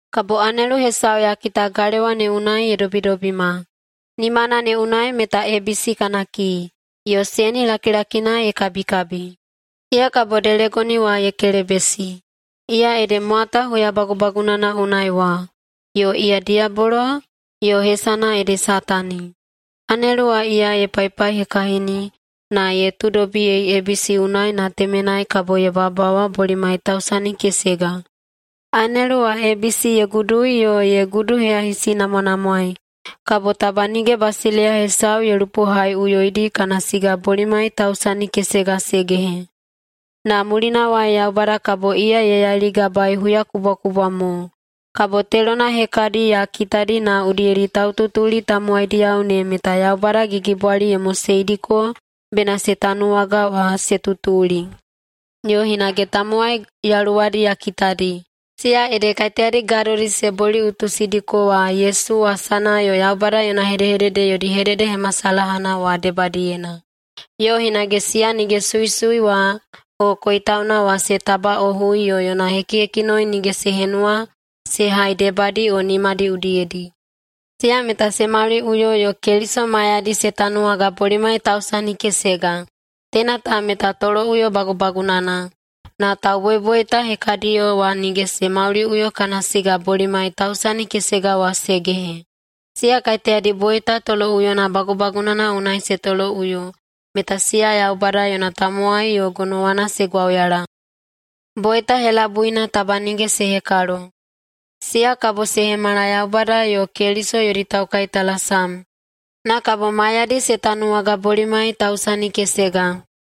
Kabo anelu hesau ya kita galewa ne unai ye dobidobima, nimana ne unai meta ebisi kana kii, yo seni lakilakina ye kabikabi. Iya kabo delegoni wa ye kelebesi. Iya ede mwata huya bagubagunana unai wa yo iya diyabolo yo hesana ede Satani. Anelu wa iya ye paipaihekahini, na ye tuudobiyei ebisi unai na temenai kabo ye bawabawa bolimai tausani kesega. Anelu wa ebisi ye gudui yo ye guduyahisinamwanamwaei, kabo taba nige basileiya hesau ye lupohaiꞌuyoidi kana siga bolimai tausani kesega se gehe. Na mulinawai Yaubada kabo iya ye yailigabaei huyakubwakubwa mo. Kabo telona hekadi ya kitadi na udiyedi taututuli tamowaidiyao ne meta Yaubada gigibwali ye moseidiko bena se tanuwaga wa se tutuli. Yo hinage tamowai yaluwadi ya kitadi. Siya ede kaiteyadi gadodi se boliꞌutusidiko wa Yesu wasana yo Yaubada yona hedehedede yodi hededehemasalahana wa debadiyena. Yo hinage siya nige suisui wa o koitauna wa se tabaꞌohui yo yona hekihekinoi nige se henuwa se hai debadi o nimadi udiyedi. Siya meta se mauliꞌuyo yo Keliso maiyadi se tanuwaga bolimai tausani kesega. Teina ta meta toloꞌuyo bagubagunana. Na tauboiboita hekadiyo wa nige se mauliꞌuyo kana siga bolimai tausani kesega wa se gehe. Siya kaiteyadi boita toloꞌuyona bagubagunana unai se toloꞌuyo meta siya Yaubada yona tamowai yo gonowana se gwauyala. Boita helabuina taba nige se hekalo. Siya kabo se hemala Yaubada yo Keliso yodi taukaitalasam, na kabo maiyadi se tanuwaga bolimai tausani kesega.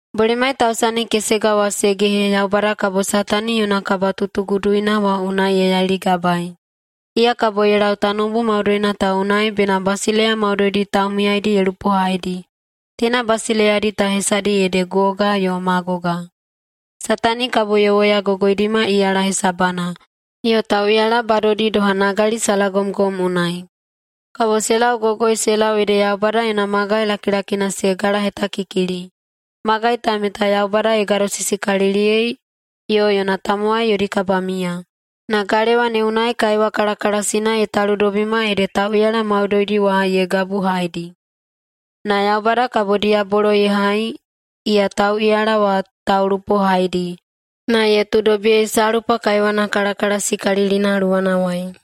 Bolimai tausani kesega wa se gehe Yaubada kabo Satani yona kabatutuguduina wa unai ye yailigabaei. Iya kabo ye lau tanoubu maudoina ta unai bena basileiya maudoidi taumiyaidi ye lupohaidi. Teina basileiyadi ta hesadi ede Goga yo Magoga. Satani kabo ye woyagogoidima iyala hesabana, yo tauꞌiyala badodi doha nagali salagomgom unai. Kabo se laugogoi se lau ede Yaubada yona magai lakilakina se galahetakikili. Magai ta meta Yaubada ye gadosisikaliliyei yo yona tamowai yodi kabamiya. Na galewa ne unai kaiwa kalakalasina ye taludobima ede tauꞌiyala maudoidi wa ye gabuhaidi. Na Yaubada kabo diyabolo ye hai, iya tauꞌiyala wa taulupohaidi, na ye tuudobiyei salpa kaiwana kalakalasikalilina luwanawai.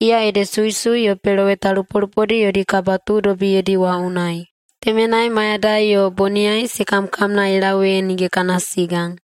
Iya ede suisui yo peloweta lupolupodi yodi kabatuudobiyedi wa unai. Temenai mayadai yo boniyai se kamkamna ye lau ee nige kana siga.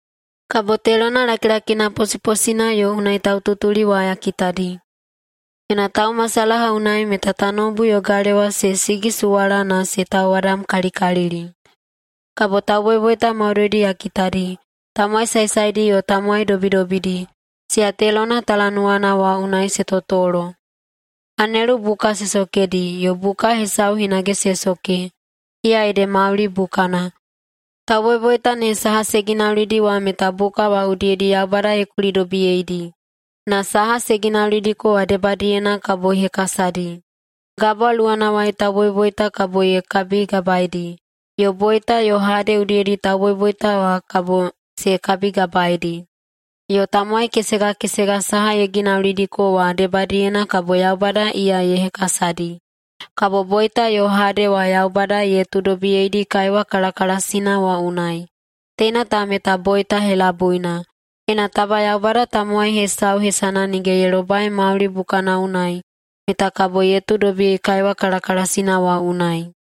Kabo telona lakilakina posiposina yo unai taututuli wa ya kitadi. Yona taumasalaha unai meta tanoubu yo galewa se sigisuwala na se tauwadamkalikalili. Kabo tauboiboita maudoidi ya kitadi, tamowai saesaedi yo tamowai dobidobidi, siya telona talanuwana wa unai se totolo. Anelu buka se sokedi, yo buka hesau hinage se soke, iya ede mauli bukana. Tauboiboita ne saha se ginaulidi wa meta buka wa udiyedi Yaubada ye kulidobiyeidi, na saha se ginaulidiko wa debadiyena kabo ye hekasadi. Gabwa luwanawai tauboiboita kabo ye kabigabaedi, yo Boita yo Hade udiyedi tauboiboita kabo se kabigabaedi. Yo tamowai kesega kesega saha ye ginaulidiko wa debadiyena kabo Yaubada iya ye hekasadi. Kabo Boita yo Hade wa Yaubada ye tuudobiyeidi kaiwa kalakalasina wa unai. Teina ta meta boita helabuina. Ena taba Yaubada tamowai hesau hesana nige ye lobai mauli bukana unai meta kabo ye tuudobiyei kaiwa kalakalasina wa unai.